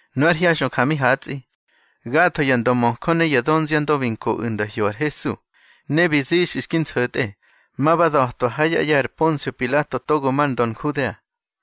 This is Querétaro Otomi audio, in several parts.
Nu ár hyaxꞌö ja mi hatsꞌi, gatho ya ndömöjö ne ya dönziandö bi nkoꞌu̱ nda hyo ar Hesu. Ne bi zixꞌu̱ xki nso̱tꞌe, ma ba da̱twa ha yá ꞌye̱ ar Ponsio Pilato togo mar ndö Nhudea.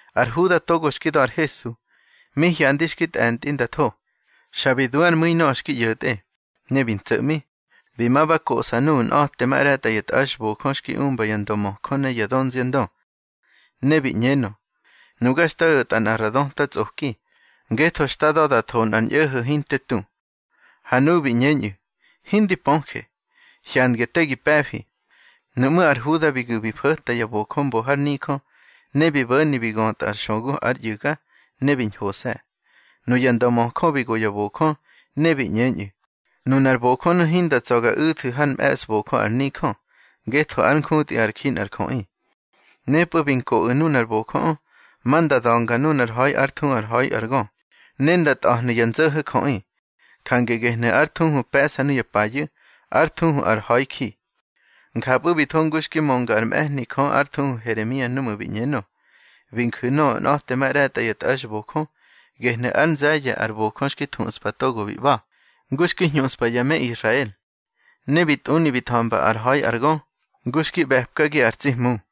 Ar Huda togo xki da̱ ar Hesu, mi hyandi xki tꞌe̱ntꞌi nda tho, xa bi du ár mu̱i nöꞌö xki ꞌyo̱tꞌe. Ne bi ntso̱ꞌmi, bi ma ba koꞌsa nuꞌu̱ nꞌa̱temaꞌre̱tꞌa ya tꞌaxbojö xki umba ya ndömöjö ne ya dönziandö. Ne bi ꞌñenö: —Nuga xta o̱tꞌa nꞌa ra döta tsꞌoki, ngetho xta da̱ da tho nꞌar ñꞌo̱ho̱ hinte tu. Ha nuꞌu̱ bi ꞌñeñꞌu̱: —Hindi pöje. Hyandge te gi pe̱fi. Nuꞌmú̱ ar Huda bi gu̱ bi fo̱ta ya bojö mbo har nijö, ne bi bo̱ni bi götꞌa ar xögu ár ꞌyu̱ga, ne bi ñhose̱. Nuya ndömöjö bi go ya bojö, ne bi ꞌñeñꞌu̱: —Nunar bojönu̱ hinda tsa̱ ga u̱thu̱ hár mꞌe̱sbojö ar nijö, ngetho ár njutꞌi ár ji nꞌar jöꞌi. Nepꞌu̱ bi nkoꞌu̱ nunar bojöꞌö, ma nda da̱nga nunar ha̱i ár thuhu ár Ha̱i ar Gö, ne nda ntꞌa̱hnu̱ ya nzo̱ho̱ jöꞌi. Jange gehnu̱ ár thuhu pe̱ꞌsa nuya payu̱, ár thuhu ar Ha̱iji. Njapꞌu̱ bi tho ngu xki mönga ár mꞌe̱hni Jö ár thuhu Heremia núꞌmu̱ bi ꞌñenö: Bi nju̱ nöꞌö nꞌa̱temaꞌre̱tꞌa ya tꞌaxbojö, gehnu̱ ár nze̱ye̱ ar bojö xki thuꞌspa togo bi ꞌba̱, ngu xki hñuꞌspa ya me Israel. Ne bi tꞌuni bi tha̱mba ár ha̱i ar gö, ngu xki ꞌbe̱pkagi ar tsi Hmu.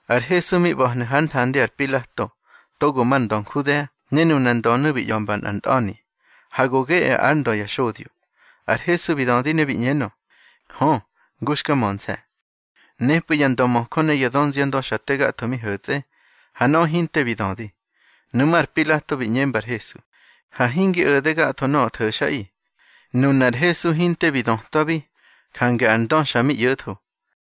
Ar Hesu mi ꞌba̱hnu̱ hár nthandi ar Pilato, togo mar ndö Nhudea, ne nunar ndönu̱ bi ꞌya̱mba nꞌar ntꞌa̱ni: —Ha go geꞌe ár Ndö ya xodyo. Ar Hesu bi dödi ne bi ꞌñenö: —Hö, ngu xka mönse̱. Nepꞌu̱ ya ndömöjö ne ya dönziandö xa te gatho mi ho̱tsꞌe, ha nöꞌö hinte bi dödi. Nuꞌmú̱ ar Pilato bi ꞌñemba ar Hesu: —Ha hingi o̱de gatho nöꞌö tho̱xꞌaꞌi. Nunar Hesu hinte bi dötwabi, jange ar ndö xa mi ꞌyo̱tho.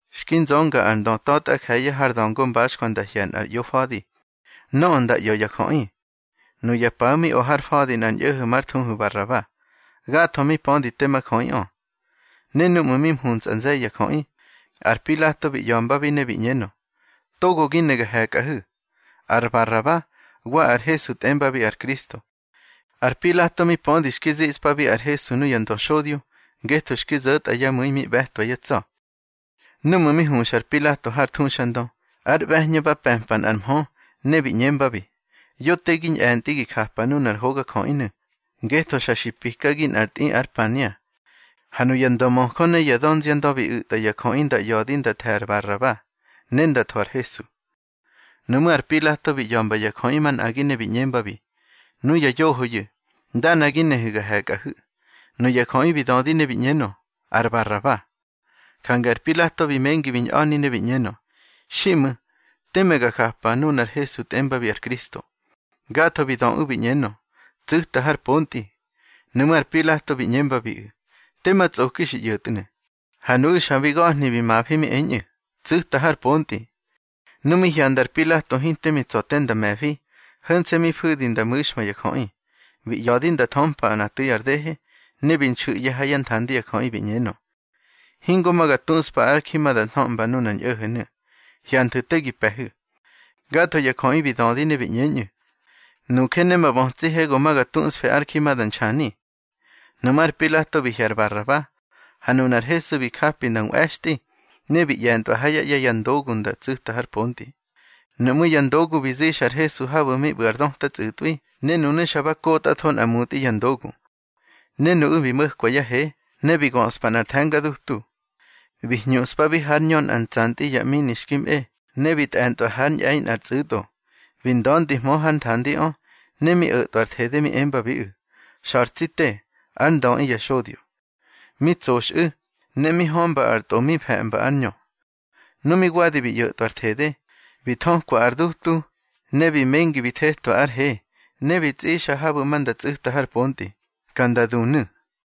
Xki nzönga ar ndö ta̱tꞌa je̱ye̱ har da̱ngo mbaxjwa nda hye̱ nꞌar ꞌyofa̱di, nöꞌö nda ꞌya̱ ya jöꞌi. Nuya paꞌu̱ mi o ar fa̱di nꞌar ñꞌo̱ho̱ már thuhu Baraba. Gatho mi pödi tema jöꞌiꞌö. Ne núꞌmu̱ mi mhuntsꞌa nze̱ye̱ ya jöꞌi, ar Pilato bi ꞌya̱mbabi ne bi ꞌñenö: —Togo gi ne ga he̱kꞌahu̱, ar Baraba wa ar Hesu tꞌembabi ar Kristo. Ar Pilato mi pödi xki ziꞌspabi ar Hesu nuya ndöxodyo, ngetho xki zo̱tꞌa yá mu̱i mi ꞌbe̱twa yá tsa̱. Núꞌmu̱ mi huxa ar Pilato har thuxandö, ár ꞌbe̱hñö ba pe̱mpa nꞌar mhö, ne bi ꞌñembabi: Yo te gi ñꞌe̱ntꞌi gi japa nunar hogajöꞌinu̱, ngetho xa xi pikagi nꞌar tꞌi ar pania. Ha nuya ndömöjö ne ya dönziandö bi u̱tꞌa ya jöꞌi nda ꞌya̱di nda the̱ ar Baraba, ne nda tho ar Hesu. Nuꞌmú̱ ar Pilato bi ꞌya̱mba ya jöꞌi manꞌagi ne bi ꞌñembabi: —Nuya yohoyu̱, ndana gi nehu̱ ga he̱kꞌahu̱. Nuya jöꞌi bi dödi ne bi ꞌñenö: —Ar Baraba. Jange ar Pilato bi mengi bi ñꞌa̱ni ne bi ꞌñenö: —Xiꞌmu̱, teme ga japa nunar Hesu tꞌembabi ar Kristo. Gatho bi döꞌu̱ bi ꞌñenö: —Tsu̱ta har pontꞌi. Nuꞌmú̱ ar Pilato bi ꞌñembabiꞌu̱: —Tema tsꞌoki xi ꞌyo̱tnu̱. Ha nuꞌu̱ xa bi ga̱hni bi mafi mi eñꞌu̱: —Tsu̱ta har pontꞌi. Nu mi hyanda ar Pilato hinte mi tsa̱ te nda me̱fi, ho̱nse̱ mi fu̱di nda mu̱xma ya jöꞌi, bi ꞌya̱di nda thömpa nꞌa tu̱i ar dehe, ne bi nxu̱ꞌye̱ ha yá nthandi ya jöꞌi, bi ꞌñenö: —Hingo ma ga tuꞌspa ár ji ma da nhöꞌmba nunar ñꞌo̱ho̱nu̱. Hyanthu̱ te gi pe̱hu̱. Gatho ya jöꞌi bi dödi ne bi ꞌñeñꞌu̱: —Nuje ne ma bötsihe go ma ga tusfe ár ji ma da nxani. Nuꞌmú̱ ar Pilato bi hye̱ ar Baraba. Ha nunar Hesu bi japi nda nꞌwe̱xtꞌi, ne bi ꞌye̱ntꞌwa ha yá ꞌye̱ ya ndogu nda tsu̱ta har pontꞌi. Nuꞌmú̱ ya ndogu bi zixa ar Hesu habu̱ mi ꞌbu̱ ar döta tsꞌu̱tꞌwi, ne nunu̱ xa ba kotꞌatho nꞌa mutꞌi ya ndogu. Ne nuꞌu̱ bi mo̱kwa yá he, ne bi göꞌspa nꞌar the̱nga dutu. Bi hñuꞌspabi hár ñö nꞌa ntsantꞌi ya ꞌmini xki mꞌe, ne bi tꞌe̱ntꞌwa hár ñꞌe̱i nꞌar tsꞌu̱tꞌo. Bi nda̱ndihmö hár nthandiꞌö, ne mi o̱tꞌwa ar thede mi embabiꞌu̱: —Xa̱r tsi te, ár Ndöꞌi ya xodyo. Mi tsoxꞌu̱, ne mi hömba ar tꞌo mi fe̱mba ár ñö. Nu mi wadi bi ꞌyo̱tꞌwa ar thede, bi thökwa ar dutu, ne bi mengi bi thetwa ár he, ne bi tsꞌixa habu̱ ma nda tsꞌu̱ta har pontꞌi, ka nda dunu̱.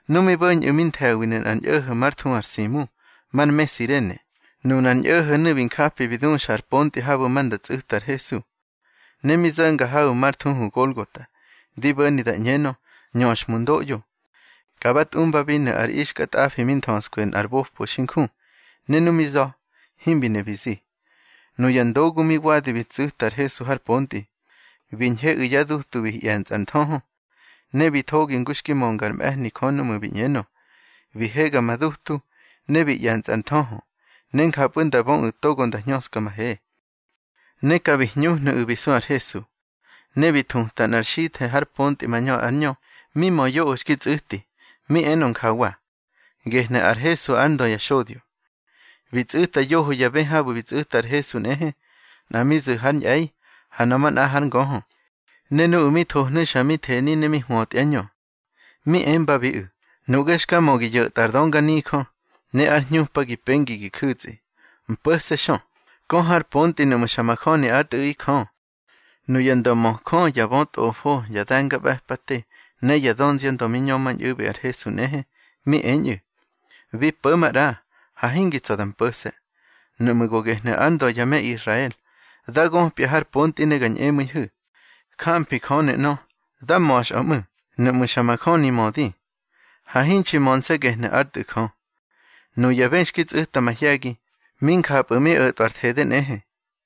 Nu mi bo̱ñꞌu̱ bi nthe̱winu̱ nꞌar ñꞌo̱ho̱ már thuhu ar Simu, mar me Sirene. Nunar ñꞌo̱ho̱nu̱ bi njapi bi duxa ar pontꞌi habu̱ ma nda tsꞌu̱ta ar Hesu. Ne mi zo̱nga habu̱ már thuhu Golgota, di bo̱ni da ꞌñenö, Nñöxhmundoꞌyo. Ka ba tꞌumbabinu̱ ar ixkatꞌafi mi nthöskwi nꞌar bopo xi nju, ne nu mi za̱, himbi ne bi zi. Nuya ndogu mi wadi bi tsu̱ta ar Hesu har pontꞌi, bi ñheꞌu̱ yá dutu bi ꞌye̱ntsꞌa ar nthöhö. Ne bi thogi ngu xki mönga ár mꞌe̱hni Jö núꞌmu̱ bi ꞌñenö: Bi hega ma dutu, ne bi ꞌye̱ntsꞌa ar nthöhö, ne njapꞌu̱ nda böꞌu̱ togo nda hñöska ma he. Ne ka bi hñuhnu̱ꞌu̱ bi su ar Hesu. Ne bi thuta nꞌar xithe̱ har pontꞌi mañö ár ñö, mi mö yoꞌö xki tsꞌu̱ti, mi enö njawa: Gehnu̱ ar Hesu, ár Ndö ya xodyo. Bi tsꞌu̱ta yoho ya bë habu̱ bi tsꞌu̱ta ar Hesu nꞌehe, nꞌa mi zu̱ hár ñꞌe̱i, ha nöꞌö manꞌa hár ngöhö. Ne nuꞌu̱ mi thohnu̱ xa mi theni ne mi hwötyá ñö. Mi embabiꞌu̱: —Nuꞌge xka mö gi yo̱tꞌa ar dönganijö, ne ár hñupa gi pengi gi ju̱tsꞌi, mpo̱se̱ xö, kö har pontꞌi nuꞌmu̱ xa majöni ár Tꞌu̱ꞌi Jö. Nuya ndömöjö, ya bötꞌofo, ya de̱ngaꞌbe̱pate ne ya dönziandö mi ñömañꞌu̱bi ar Hesu nꞌehe, mi eñꞌu̱: —Bi po̱ maꞌra, ha hingi tsa̱ da mpo̱se̱. Nuꞌmu̱ go gehnu̱ ár Ndö ya me Israel, dá göpya har pontꞌi ne ga ñꞌemu̱ihu̱. Jamfi Jönu̱ ꞌnö. Dá ma̱xꞌö ꞌmu̱, nuꞌmu̱ xa majöni mödi. Ha hinxi mönse̱ gehnu̱ ár Tꞌu̱ Jö. Nuya bë xki tsꞌu̱ta mahye̱gi, mi njapꞌu̱ mi o̱tꞌwa ar thede nꞌehe.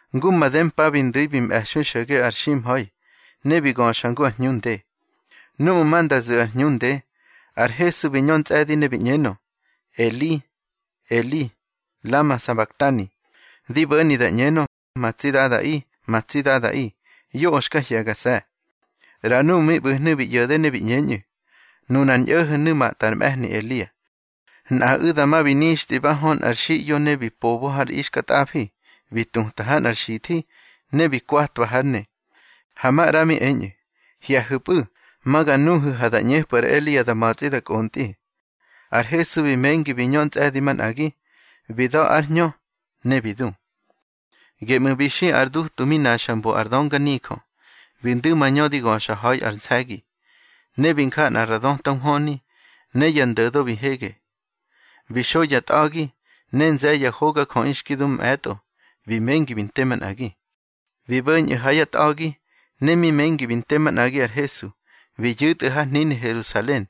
Ngu made mpa bi ndu̱i bi mꞌe̱xui xo̱ge ar ximha̱i, ne bi göxa ngu ar hñu nde. Núꞌmu̱ ma nda zu̱ ar hñu nde, ar Hesu bi ñö ntsꞌe̱di ne bi ꞌñenö: —Eli, Eli, lama sabaktani. Di bo̱ni da ꞌñenö: Ma tsi Dada, ma tsi Dadaꞌi, yoꞌö xka hye̱gase̱. ꞌRa nuꞌu̱ mi ꞌbu̱hnu̱ bi ꞌyo̱de ne bi ꞌñeñꞌu̱: —Nunar ñꞌo̱ho̱nu̱ matꞌa ar mꞌe̱hni Elia. Nꞌaꞌu̱ dama bi nixtꞌi ba hö nꞌar xiꞌyo ne bi pobo har ixkatꞌafi, bi tuta ha nꞌar xithi, ne bi kwatwa hár ne. Ha maꞌra mi eñꞌu̱: —Hye̱hu̱pꞌu̱, ma ga nuhu̱ ha da ꞌñepꞌu̱ ar Elia da ma̱tsꞌi da kꞌontꞌi. Ar Hesu bi mengi bi ñö ntsꞌe̱di manꞌagi, bi da̱ ár hñö ne bi du. Geꞌmu̱ bi xi ar dutu mi naxa mbo ar dönganijö, bi ndu̱ mañö di göxa ha̱i ár nse̱gi. Ne bi nja nꞌa ra döta nhwöni, ne ya ndo̱do bi hege. Bi xo ya tꞌa̱gi, ne nze̱ye̱ ya hogajöꞌi xki du mꞌe̱tꞌo bi mengi bi nte manꞌagi. Bi bo̱ñꞌu̱ ha yá tꞌa̱gi, ne mi mengi bi nte manꞌagi ar Hesu, bi yu̱tꞌu̱ har hnini Herusalen,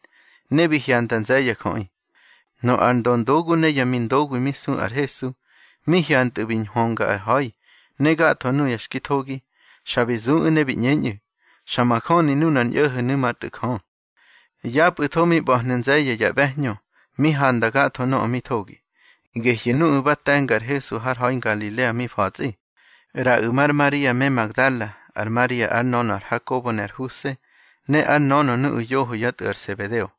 ne bi hyanda nze̱ye̱ ya jöꞌi. Nöꞌö ar döndogu ne yá mindoguwi mi su ar Hesu, mi hyantꞌu̱ bi nhwönga ar ha̱i ne gatho nuya xki thogi, xa bi zuꞌu̱ ne bi ꞌñeñꞌu̱: —Xa majöni nunar ñꞌo̱ho̱nu̱ már Tꞌu̱ Jö. Yapꞌu̱tho mi ꞌba̱hnu̱ nze̱ye̱ ya ꞌbe̱hñö, mi handa gatho nöꞌö mi thogi, gehyu̱ nuꞌu̱ ba te̱nga ar Hesu har ha̱i Ngalilea mi fa̱tsꞌi. ꞌRaꞌu̱ mar Maria me Magdala, ar Maria ár nönö ar Hakobo ne ar Huse, ne ár nönö nuꞌu̱ yoho yá tꞌu̱ ar Sebedeo.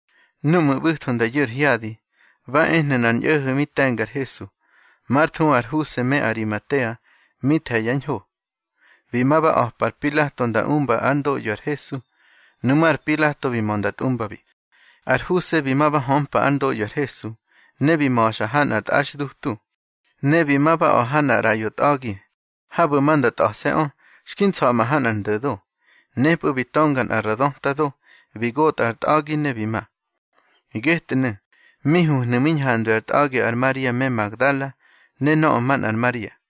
Núꞌmu̱ ꞌbu̱tho nda yu̱ ar hyadi, ba ehnu̱ nꞌar ñꞌo̱ho̱ mi te̱nga ar Hesu, már thuhu ar Huse me Arimatea, mi the̱ ya ñho. Bi ma ba a̱pa ar Pilato nda umba ár ndoꞌyo ar Hesu. Nuꞌmú̱ ar Pilato bi mö nda tꞌumbabi. Ar Huse bi ma ba hömpa ár ndoꞌyo ar Hesu, ne bi ma̱xa ha nꞌar tꞌaxdutu. Ne bi ma ba a̱ ha nꞌar ꞌraꞌyo tꞌa̱gi, habu̱ ma nda tꞌa̱se̱ꞌö, xki nsa̱ꞌma ha nꞌar ndo̱do. Nepꞌu̱ bi tönga nꞌa ra döta do, bi gota ar tꞌa̱gi, ne bi ma. Getnu̱, mi huhnu̱ mi ñhandwi ar tꞌa̱gi ar Maria me Magdala ne nöꞌö manꞌar Maria.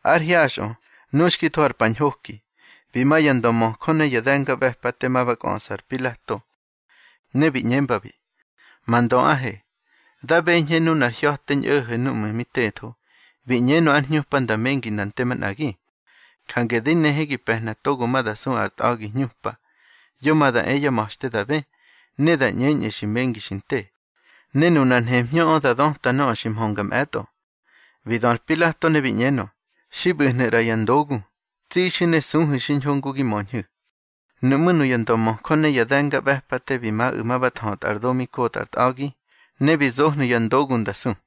Ár hyaxꞌö, nu xki tho ár pa ñhoki, bi ma ya ndömöjö ne ya de̱ngaꞌbe̱pate, ma ba kꞌöꞌsa ar Pilato, ne bi ꞌñembabi: —Ma ndöꞌahe, da beñhe nunar hya̱te ñꞌo̱ho̱ núꞌmu̱ mi tetho, bi ꞌñenö ár hñupa nda mengi nda nte manꞌagi. Jange di nehe gi pe̱hna togo ma da su ar tꞌa̱gi hñupa, yo ma da e yá ma̱xte da bë, ne da ꞌñeñꞌu̱ xi mengi xi nte. Ne nunar nhemhñöꞌö da döta nöꞌö xi mhönga mꞌe̱tꞌo. Bi dö ar Pilato ne bi ꞌñenö: —Xi ꞌbu̱hnu̱ ꞌra ya ndogu, tsixu̱ ne suhu̱ xiñho ngu gi möñhu̱. Nuꞌmú̱ nuya ndömöjö ne ya de̱ngaꞌbe̱pate bi maꞌu̱ ma ba thötꞌa ar do mi kotꞌa ar tꞌa̱gi, ne bi zohnu̱ ya ndogu nda su.